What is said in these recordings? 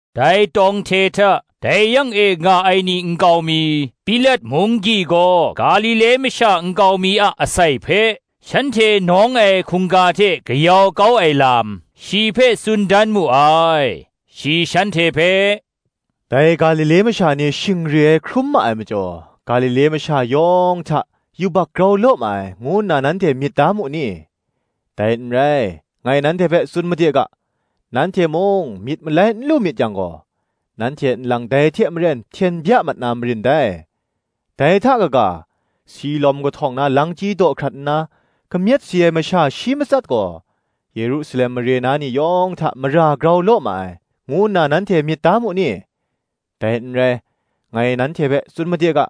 Dai tawng hte hta, dai yang e nga ai ni nkau mi, Pilat munggyi gaw Galile masha nkau mi a asai hpe, shanhte nawng ai hkungga hte kayau kau ai lam, shi hpe tsun dan mu ai. Shi shanhte hpe, “Dai Galile masha ni shing re ai hkrum ma ai majaw, Galile masha yawng hta yubak grau law ma ai, ngu nna nanhte myit da mu ni? Dai n rai, ngai nanhte hpe tsun made ga; nanhte mung myit malai n lu myit yang gaw, nanhte nlang dai hte maren hten bya mat na marin dai. Dai hta kaga, ‘Siloam kahtawng na langchyi daw hkrat nna, kamyet si ai masha shi matsat gaw, Yerusalem mare na ni yawng hta mara grau law ma ai,’ ngu nna nanhte myit da mu ni? Dai n rai, ngai nanhte hpe tsun made ga;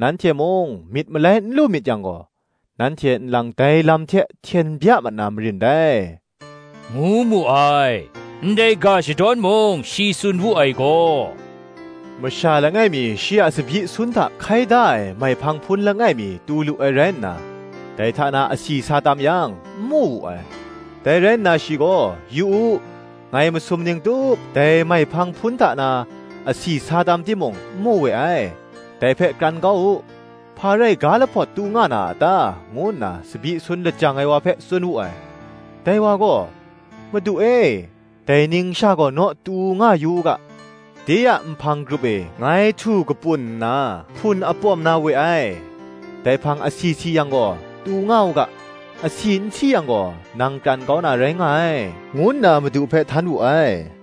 nanhte mung myit malai n lu myit yang gaw, nanhte nlang dai lam hte hten bya mat na marin dai,” ngu mu ai. Ndai ga shadawn mung shi tsun wu ai gaw, “Masha langai mi shi a tsabyi sun hta hkai da ai maihpang hpun langai mi tu lu ai rai nna, dai hta na asi sa tam yang, n mu wu ai. Dai rai nna shi gaw, ‘Yu u, ngai masum ning tup dai maihpang hpun hta na asi sa tam timung n mu we ai; dai hpe kran kau u: hpa rai ga lahpawt tu nga na a ta?’ ngu nna tsabyi sun lajang ai wa hpe tsun wu ai. Dai wa gaw, ‘Madu e, dai ning sha gaw naw tu nga yu u ga, de a nhpang grup e ngai htu kapun nna hpun apawm na we ai: dai hpang asi si yang gaw, tu nga u ga: asi n si yang gaw, nang kran kau na rai nga ai,” ngu nna madu hpe htan wu ai.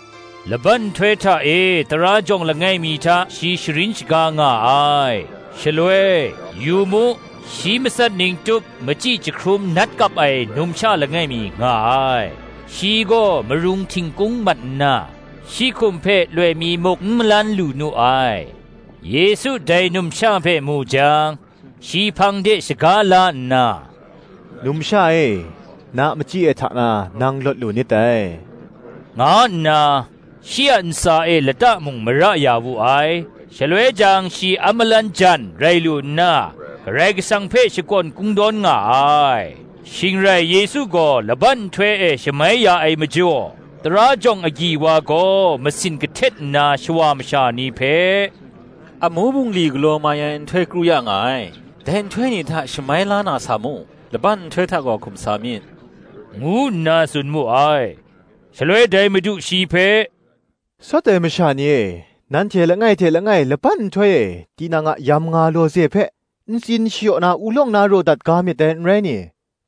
Laban nhtoi hta e tara jawng langai mi hta shi sharin shaga nga ai. Shaloi, Yu mu, shi matsat ning tup machyi jahkrum nat kap ai numsha langai mi nga ai: shi gaw marung htingkung mat nna, shi hkum hpe loi mi muk n malan lu nu ai. Yesu dai numsha hpe mu jang, shi hpang de shaga la nna, “Numsha e, na machyi ai hta na nang lawt lu nit dai,” nga nna shi a ntsa e lata mung mara ya wu ai: shaloi jang shi a malang jan rai lu nna, Karai Kasang hpe shakawn kungdawn nga ai. Shing rai Yesu gaw laban nhtoi e shamai ya ai majaw, tara jawng agyi wa gaw masin kahtet nna shawa masha ni hpe, “Amu bungli galaw mai ai nhtoi kru ya nga ai; dai nhtoi ni hta shamai la na sa mu: laban nhtoi hta gaw hkum sa myit,” ngu nna tsun mu ai. Shaloi dai Madu shi hpe, “Sawt ai masha ni e, nanhte langai hte langai laban nhtoi e tinang a yamnga lawze hpe ntsin shayaw na ulawng na raw dat ga myit dai, n rai ni?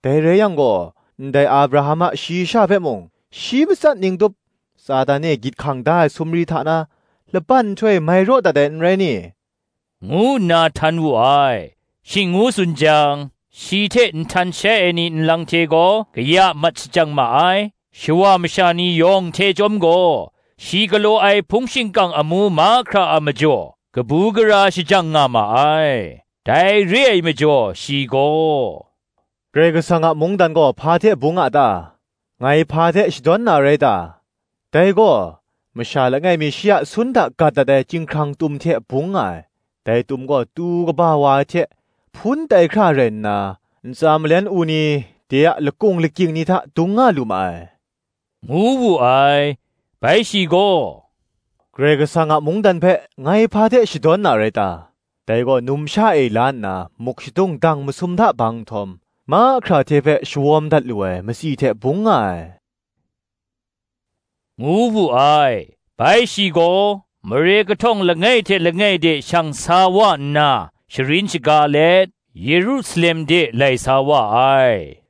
Dai rai yang gaw, ndai Abraham a shayi sha hpe mung, shi matsat ning tup, Satan e gyit hkang da ai sumri hta na, laban nhtoi e mai raw dat ai, n rai ni?” ngu nna htan wu ai. Shing ngu tsun jang, shi hte nhtan shai ai ni nlang hte gaw kaya mat shajang ma ai: shawa masha ni yawng hte chyawm gaw, shi galaw ai hpung shingkang amu mahkra a majaw, kabu gara shajang nga ma ai. Dai re ai majaw shi gaw, “Karai Kasang a mungdan gaw hpa hte bung a ta? ngai hpa hte shadawn na rai ta? Dai gaw, masha langai mi shi a sun hta gat dat ai chyinghkrang tum hte bung nga ai: dai tum gaw tu kaba wa ai hte, hpun tai hkra rai nna, ntsa malen u ni de a lakung lakying ni hta dung nga lu ma ai,” ngu wu ai. Bai shi gaw, “Karai Kasang a mungdan hpe, ngai hpa hte shadawn na rai ta? Dai gaw, numsha e la nna, muk shadung dang masum hta bang nhtawm, mahkra hte hpe shawawm dat lu ai matsi hte bung nga ai,” ngu wu ai. Bai shi gaw, mare kahtawng langai hte langai de shang sa wa nna, sharin shaga let, Yerusalem de lai sa wa ai.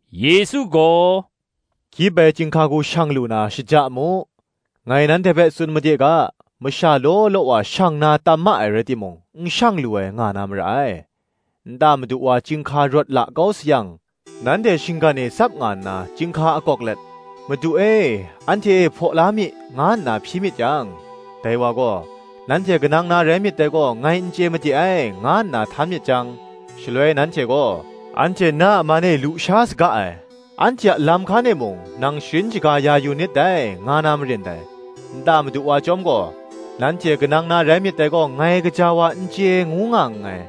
Yesu gaw, “Gyip ai chyinghka hku shang lu na, shaja mu: ngai nanhte hpe tsun made ga, masha law law wa shang na tam ma ai rai timung, n shang lu ai nga na mara ai. Nta madu wa chyinghka rawt la kau sayang, nanhte shinggan e tsap nga nna chyinghka akawk let, ‘Madu e, anhte e hpaw la mi,’ nga nna hpyi myit yang, dai wa gaw, ‘Nanhte kanang na rai myit dai gaw, ngai n chye made ai,’ nga nna htan myit jang, shaloi nanhte gaw, ‘Anhte na a man e lu sha saga ai; anhte a lam hkan e mung nang sharin shaga ya yu nit dai, nga na marin dai: nta madu wa chyawm gaw, Nanhte kanang na rai myit dai gaw ngai gaja wa n chye ngu nga nngai;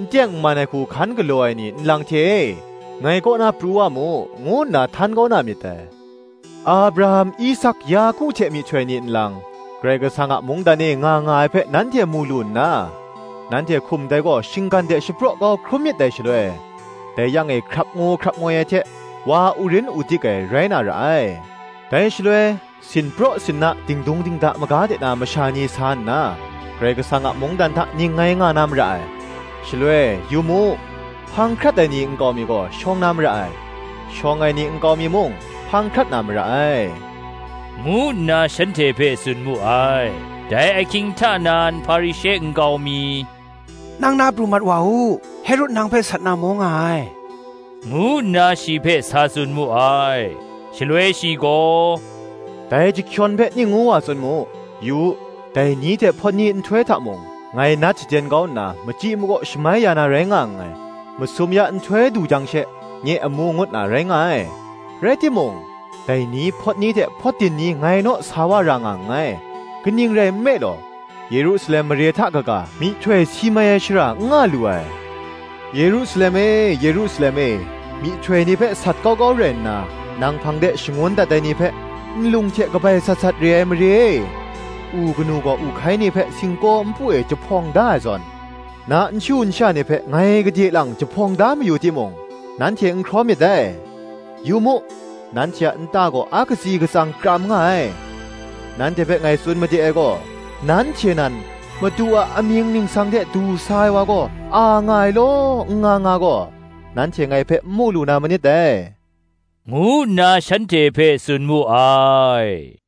n teng n man ai hku hkan galaw ai ni nlang hte e, ngai kaw na pru wa mu,’ ngu nna htan kau na myit dai. Abraham, Isak, Yaku hte myihtoi ni nlang, Karai Kasang a mungdan e nga nga ai hpe nanhte mu lu nna, nanhte hkum dai gaw shinggan de shapraw kau hkrum myit dai shaloi, dai yang e hkrap ngu hkrap ngoi ai hte wa urin udik ai, rai na ra ai. Dai shaloi, sinpraw sinna, dingdung dingda maga de na masha ni sa nna, Karai Kasang a mungdan hta ningngai nga na mara ai. Shaloi, yu mu, hpang hkrat ai ni a nkau mi gaw, shawng na mara ai; shawng ai ni nkau mi mung, hpang hkrat na mara ai,” ngu nna shanhte hpe tsun mu ai. Dai ahkying hta nan Hparishe nkau mi, “Nang na pru mat wa u: Herod nang hpe sat na maw nga ai,” ngu nna shi hpe sa tsun mu ai. Shaloi shi gaw, “Dai chyahkyawn hpe ning ngu wa tsun mu, ‘Yu u, dai ni hte hpawt ni nhtoi hta mung, ngai nat shaden kau nna machyi makaw shamai ya na rai nga nngai; masum ya nhtoi du jang she nye amu ngut na,’ rai nga ai: rai timung, dai ni, hpawt ni hte hpawt din ni ngai naw sa wa ra nga nngai: kaning rai nme law, Yerusalem mare hta kaga, myihtoi si mai ai shara n nga lu ai. “Yerusalem e, Yerusalem e, myihtoi ni hpe sat kau kau rai nna, nang hpang de shangun dat ai ni hpe nlung hte kabai sat sat re ai mare e! u kanu gaw u hkai ni hpe singkaw npu e jahpawng da ai zawn, na nshu nsha ni hpe ngai gade lang jahpawng da mayu timung, nanhte n hkraw myit dai. Yu mu, nanhte a nta gaw a katsi katsang kram nga ai. Nanhte hpe ngai tsun made ai gaw, nanhte nan, Madu a amying ningsang hte du sa ai wa gaw, a nga ai law, n nga nga gaw, nanhte ngai hpe n mu lu na manit dai, ngu nna shanhte hpe tsun mu ai.